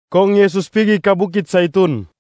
Kong Yesus pigi ka bukit Zaitun.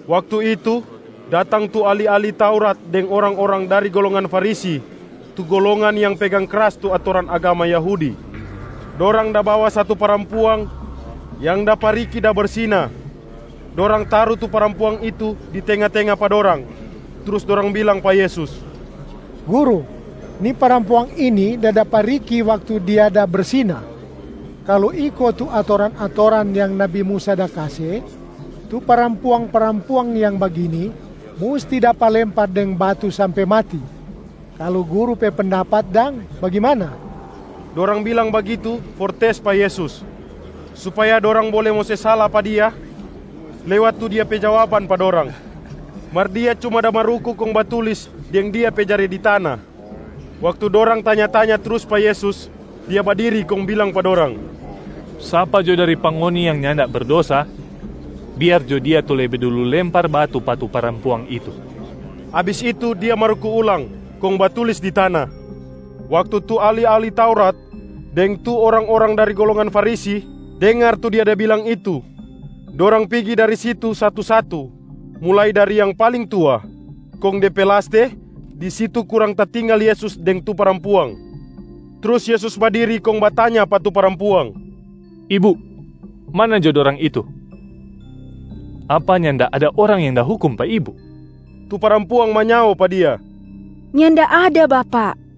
Waktu itu, datang tu ahli-ahli Taurat deng orang-orang dari golongan Farisi tu golongan yang pegang kras tu atoran agama Yahudi. Dorang da bawa satu parampuang yang dapa riki da bersina. Dorang taru tu parampuang itu di tenga-tenga pa dorang, trus dorang bilang pa Yesus, “Guru, ni parampuang ini da dapa riki waktu dia da bersina. Kalu iko tu atoran-atoran yang nabi Musa da kase, tu parampuang-parampuang yang bagini musti dapa lempar deng batu sampe mati. Kalu Guru pe pendapat dang bagimana?” Dorang bilang bagitu for tes pa Yesus, supaya dorang bole mo se sala pa Dia lewat tu Dia pe jawaban pa dorang. Mar Dia cuma da maruku kong batulis deng Dia pe jare di tana. Waktu dorang tanya-tanya trus pa Yesus, Dia badiri kong bilang pa dorang, “Sapa dari pa ngoni yang nyanda berdosa, biar jo dia tu lebe dulu lempar batu pa tu parampuang itu.” Abis itu Dia maruku ulang kong batulis di tana. Waktu tu ahli-ahli Taurat deng tu orang-orang dari golongan Farisi dengar tu Dia da bilang itu, dorang pigi dari situ satu-satu, mulai dari yang paling tua. Kong de pe laste, di situ kurang tatinggal Yesus deng tu parampuang. Trus Yesus badiri kong batanya pa tu parampuang, “Ibu, mana jo dorang itu? Apa nyanda ada orang yang da hukum pa ibu?” Tu parampuang manyao pa Dia, “Nyanda ada, Bapak.”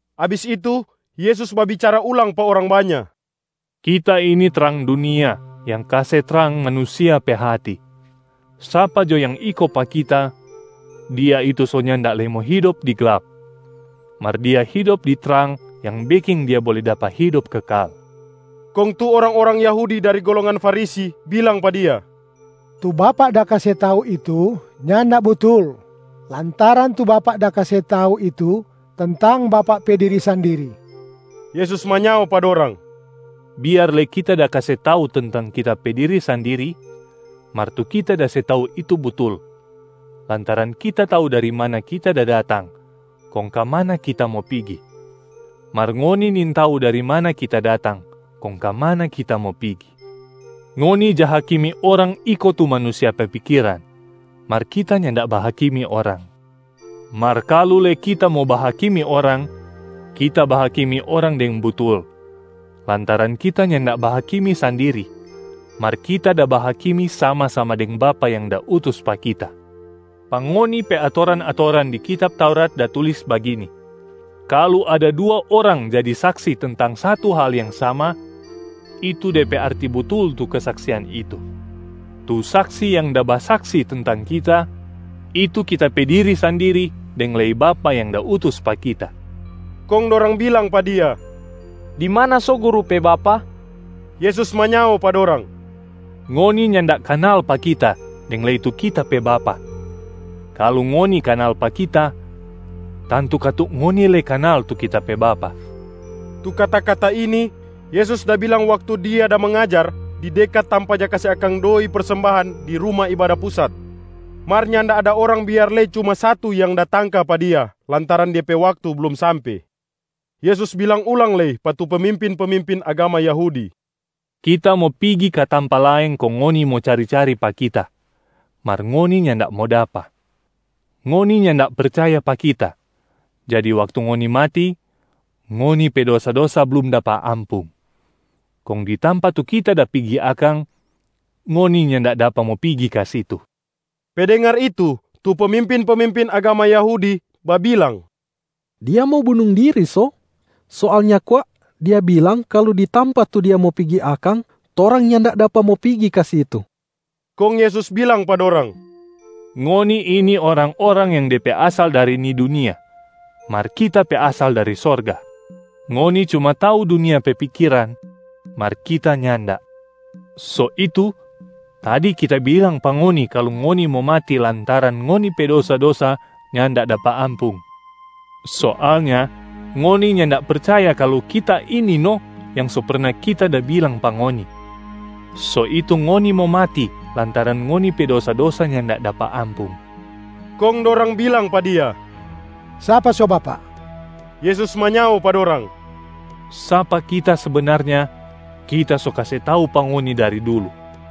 Abis itu, Yesus babicara ulang pa orang banya, “Kita ini trang dunia yang kase trang manusia pe hati. Sapa jo yang iko pa Kita, dia itu so nyanda lei mo hidop di glap, mar dia hidop di trang yang beking dia bole dapa hidop kekal.” Kong tu orang-orang Yahudi dari golongan Farisi bilang pa Dia, “Tu Bapak da kase tau itu nyanda butul, lantaran tu Bapak da kase tau itu tentang Bapak pe diri sandiri.” Yesus manyao pa dorang, “Biar lei Kita da kase tau tentang Kita pe diri sandiri, mar tu Kita da se tau itu butul lantaran Kita tau dari mana Kita da datang kong ka mana Kita mo pigi, mar ngoni nintau dari mana Kita datang kong ka mana Kita mo pigi. Ngoni ja hakimi orang iko tu manusia pe pikiran, mar Kita nyanda bahakimi orang. Mar kalu lei Kita mo bahakimi orang, Kita bahakimi orang deng butul lantaran Kita nyanda bahakimi sandiri mar Kita da bahakimi sama-sama deng Bapa yang da utus pa Kita. Pa ngoni pe atoran-atoran di kitab Taurat da tulis bagini: kalu ada dua orang jadi saksi tentang satu hal yang sama, itu de pe arti butul tu kesaksian itu. Tu saksi yang da basaksi tentang Kita, itu Kita pe diri sandiri deng lei Bapa yang da utus pa Kita.” Kong dorang bilang pa Dia, “Di mana so Guru pe Bapa?” Yesus manyao pa dorang, “Ngoni nyanda kanal pa Kita deng lei tu Kita pe Bapa. Kalu ngoni kanal pa Kita, tantu katu ngoni lei kanal tu Kita pe Bapa.” Tu kata-kata ini Yesus da bilang waktu Dia da mangajar di dekat tampa ja kase akang doi persembahan di Ruma Ibada Pusat. Mar nyanda ada orang biar lei cuma satu yang da tangka pa Dia lantaran de pe waktu blum sampe. Yesus bilang ulang lei pa tu pemimpin-pemimpin agama Yahudi, “Kita mo pigi ka tampa laeng kong ngoni mo cari-cari pa Kita, mar ngoni nyanda mo dapa. Ngoni nyanda percaya pa Kita, jadi waktu ngoni mati, ngoni pe dosa-dosa blum dapa ampung. Kong di tampa tu Kita da pigi akang, ngoni nyanda dapa mo pigi ka situ.” Pe dengar itu, tu pemimpin-pemimpin agama Yahudi babilang, “Dia mo bunung diri so? Soalnya kwa Dia bilang kalu di tampa tu Dia mo pigi akang torang nyanda dapa mo pigi ka situ.” Kong Yesus bilang pa dorang, “Ngoni ini orang-orang yang de pe asal dari ni dunia, mar Kita pe asal dari sorga. Ngoni Cuma tau dunia pe pikiran, mar Kita nyanda. So itu, tadi Kita bilang pa ngoni kalu ngoni mo mati lantaran ngoni pe dosa-dosa nyanda dapa ampung. Soalnya ngoni nyanda percaya kalu ‘Kita ini’b no yang so perna Kita da bilang pa ngoni, so itu ngoni mo mati lantaran ngoni pe dosa-dosa nyanda dapa ampung.” Kong dorang bilang pa Dia, “Sapa so Bapak?” Yesus manyao pa dorang, “Sapa Kita sebenarnya, Kita so kase tau pa ngoni dari dulu.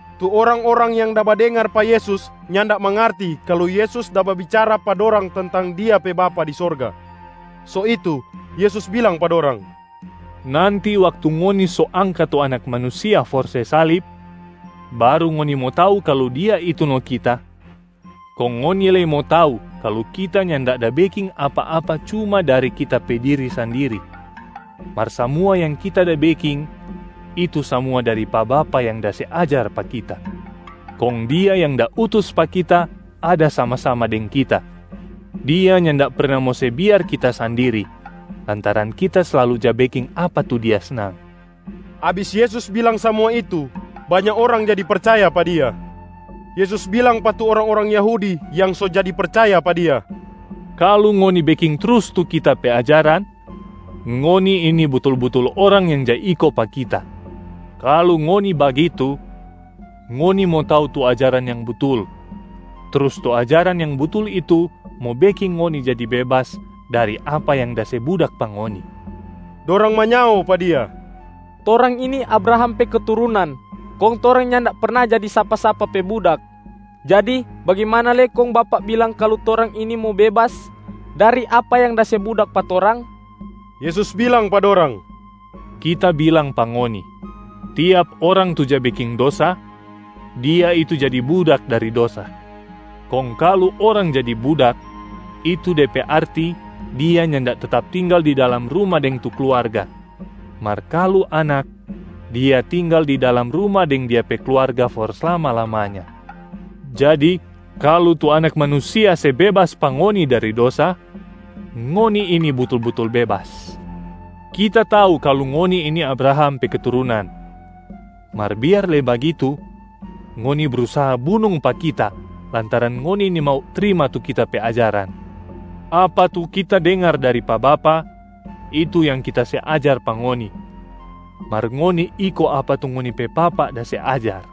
Tu orang-orang yang da badengar pa Yesus nyanda mangarti kalu Yesus da babicara pa dorang tentang Dia pe Bapa di sorga. So itu, Yesus bilang pa dorang, “Nanti waktu ngoni so angka tu Anak Manusia for se salib, baru ngoni mo tau kalu Dia itu no Kita. Kong ngoni lei mo tau kalu Kita nyanda da beking apa-apa cuma dari Kita pe diri sandiri, mar samua yang Kita da beking, itu samua dari pa Bapa yang da se ajar pa Kita. Kong Dia yang da utus pa Kita ada sama-sama deng Kita. Dia nyanda perna mo se biar Kita sandiri lantaran Kita slalu ja beking apa tu Dia snang.” Abis Yesus bilang samua itu, banya orang jadi percaya pa Dia. Yesus bilang pa tu orang-orang Yahudi yang so jadi percaya pa Dia, “Kalu ngoni beking trus tu Kita pe ajaran, ngoni ini butul-butul orang yang ja iko pa Kita. Kalu ngoni bagitu, ngoni mo tau tu ajaran yang butul trus tu ajaran yang butul itu mo beking ngoni jadi bebas dari apa yang da se budak pa ngoni.” Dorang manyao pa Dia, “Torang ini Abraham pe keturunan kong torang nyanda perna jadi sapa-sapa pe budak. Jadi bagimana lei kong Bapak bilang kalu torang ini mo bebas dari apa yang da se budak pa torang?” Yesus bilang pa dorang, “Kita bilang pa ngoni, tiap orang tu ja beking dosa, dia itu jadi budak dari dosa. Kong kalu orang jadi budak, itu de pe arti dia nyanda tetap tinggal di dalam ruma deng tu kluarga. Mar kalu anak, dia tinggal di dalam ruma deng dia pe kluarga for slama-lamanya. Jadi kalu tu Anak Manusia se bebas pa ngoni dari dosa, ngoni ini butul-butul bebas. Kita tau kalu ngoni ini Abraham pe keturunan, mar biar lei bagitu ngoni brusaha bunung pa Kita lantaran ngoni nimau trima tu Kita pe ajaran. Apa tu Kita dengar dari pa Bapa, itu yang Kita se ajar pa ngoni. Mar ngoni iko apa tu ngoni pe papa da se ajar.”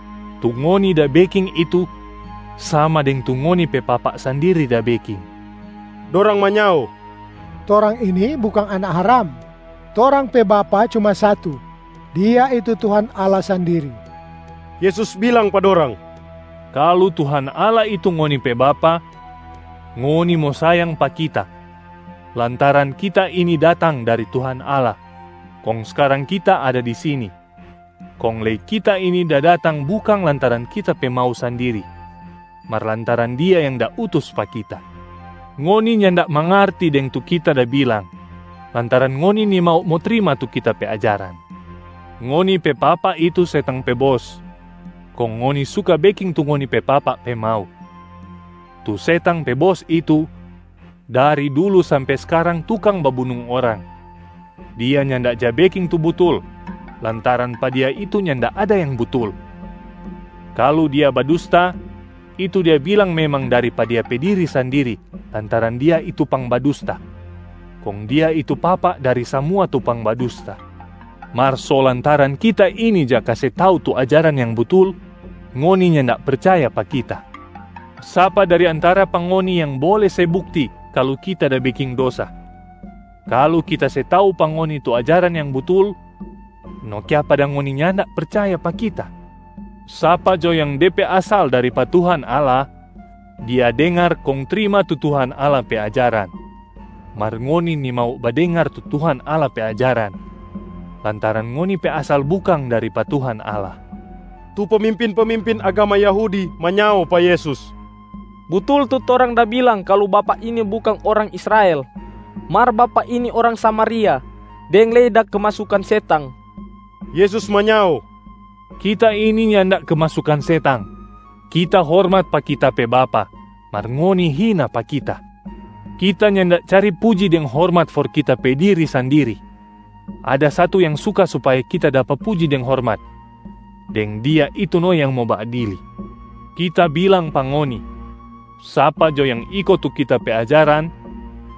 Tu ngoni da beking itu sama deng tu ngoni pe papa sandiri da beking.” Dorang manyao, “Torang ini bukang anak haram. Torang pe Bapa cuma satu, Dia itu Tuhan Allah sandiri.” Yesus bilang pa dorang, “Kalu Tuhan Allah itu ngoni pe Bapa, ngoni mo sayang pa Kita lantaran Kita ini datang dari Tuhan Allah kong skarang Kita ada di sini. Kong lei Kita ini da datang bukang lantaran Kita pe mau sandiri, mar lantaran Dia yang da utus pa Kita. Ngoni nyanda mangarti deng tu Kita da bilang lantaran ngoni nimau mo trima tu Kita pe ajaran. Ngoni pe papa itu setang pe bos, kong ngoni suka beking tu ngoni pe papa pe mau. Tu setang pe bos itu, dari dulu sampe skarang tukang babunung orang. Dia nyanda ja beking tu butul, lantaran pa dia itu nyanda ada yang butul. Kalu dia badusta, itu dia bilang memang dari pa dia pe diri sandiri lantaran dia itu pangbadusta, kong dia itu papa dari samua tu pangbadusta. Mar so lantaran Kita ini ja kase tau tu ajaran yang butul, ngoni nyanda percaya pa Kita. Sapa dari antara pa ngoni yang bole se bukti kalu Kita da beking dosa? Kalu Kita se tau pa ngoni tu ajaran yang butul, no kiapa dang ngoni nyanda percaya pa Kita? Sapa jo yang de pe asal dari pa Tuhan Allah, dia dengar kong trima tu Tuhan Allah pe ajaran. Mar ngoni nimau badengar tu Tuhan Allah pe ajaran lantaran ngoni pe asal bukang dari pa Tuhan Allah.” Tu pemimpin-pemimpin agama Yahudi manyao pa Yesus, “Butul tu torang da bilang kalu Bapak ini bukang orang Israel, mar Bapak ini orang Samariac deng lei da kemasukan setang.” Yesus manyao, “Kita ini nyanda kemasukan setang. Kita hormat pa Kita pe Bapa mar ngoni hina pa Kita. Kita nyanda cari puji deng hormat for Kita pe diri sandiri. Ada Satu yang suka supaya Kita dapa puji deng hormat, deng Dia itu no yang mo baadili. Kita bilang pa ngoni, sapa jo yang iko tu Kita pe ajaran,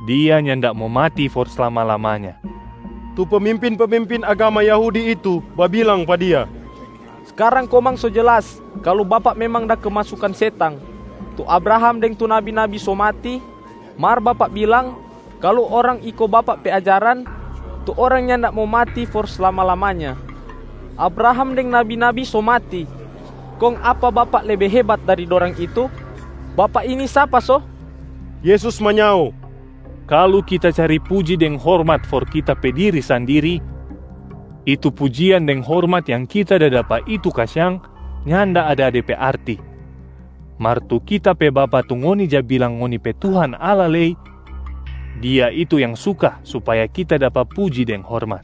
dia nyanda mo mati for slama-lamanya.” Tu pemimpin-pemimpin agama Yahudi itu babilang pa Dia, “Skarang komang so jelas kalu Bapak memang da kemasukan setang. Tu Abraham deng tu nabi-nabi so mati, mar Bapak bilang kalu orang iko Bapak pe ajaran, tu orang nyanda mo mati for slama-lamanya. Abraham deng nabi-nabi so mati, kong apa Bapak lebe hebat dari dorang itu? Bapak ini sapa so?” Yesus manyao, “Kalu Kita cari puji deng hormat for Kita pe diri sandiri, itu pujian deng hormat yang Kita da dapa itu kasiang nyanda ada de pe arti. Mar tu Kita pe Bapa tu ngoni ja bilang ngoni pe Tuhan Allah lei, Dia itu yang suka supaya Kita dapa puji deng hormat.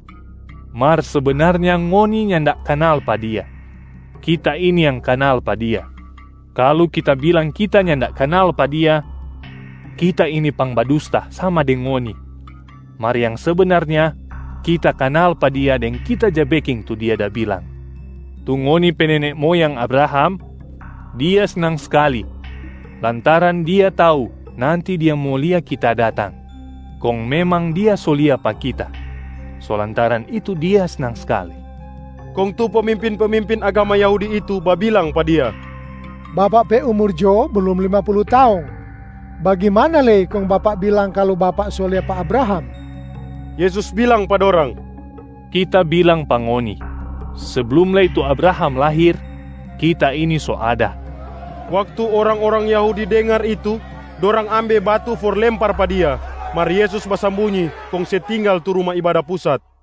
Mar sebenarnya ngoni nyanda kanal pa Dia. Kita ini yang kanal pa Dia. Kalu Kita bilang Kita nyanda kanal pa Dia, Kita ini pangbadusta sama deng ngoni. Mar yang sebenarnya Kita kanal pa Dia deng Kita ja beking tu Dia da bilang. Tu ngoni pe nene moyang Abraham, dia snang skali lantaran dia tau nanti dia mo lia Kita datang. Kong memang dia so lia pa Kita, so lantaran itu dia snang skali.” Kong tu pemimpin-pemimpin agama Yahudi itu babilang pa Dia, “Bapak pe umur jo blum lima pulu taong. Bagimana lei kong Bapak bilang kalu Bapak so lia pa Abraham?” Yesus bilang pa dorang, “Kita bilang pa ngoni, seblum lei tu Abraham lahir, Kita ini so ada.” Waktu orang-orang Yahudi dengar itu, dorang ambe batu for lempar pa Dia, mar Yesus basambunyi kong se tinggal tu Ruma Ibada Pusat.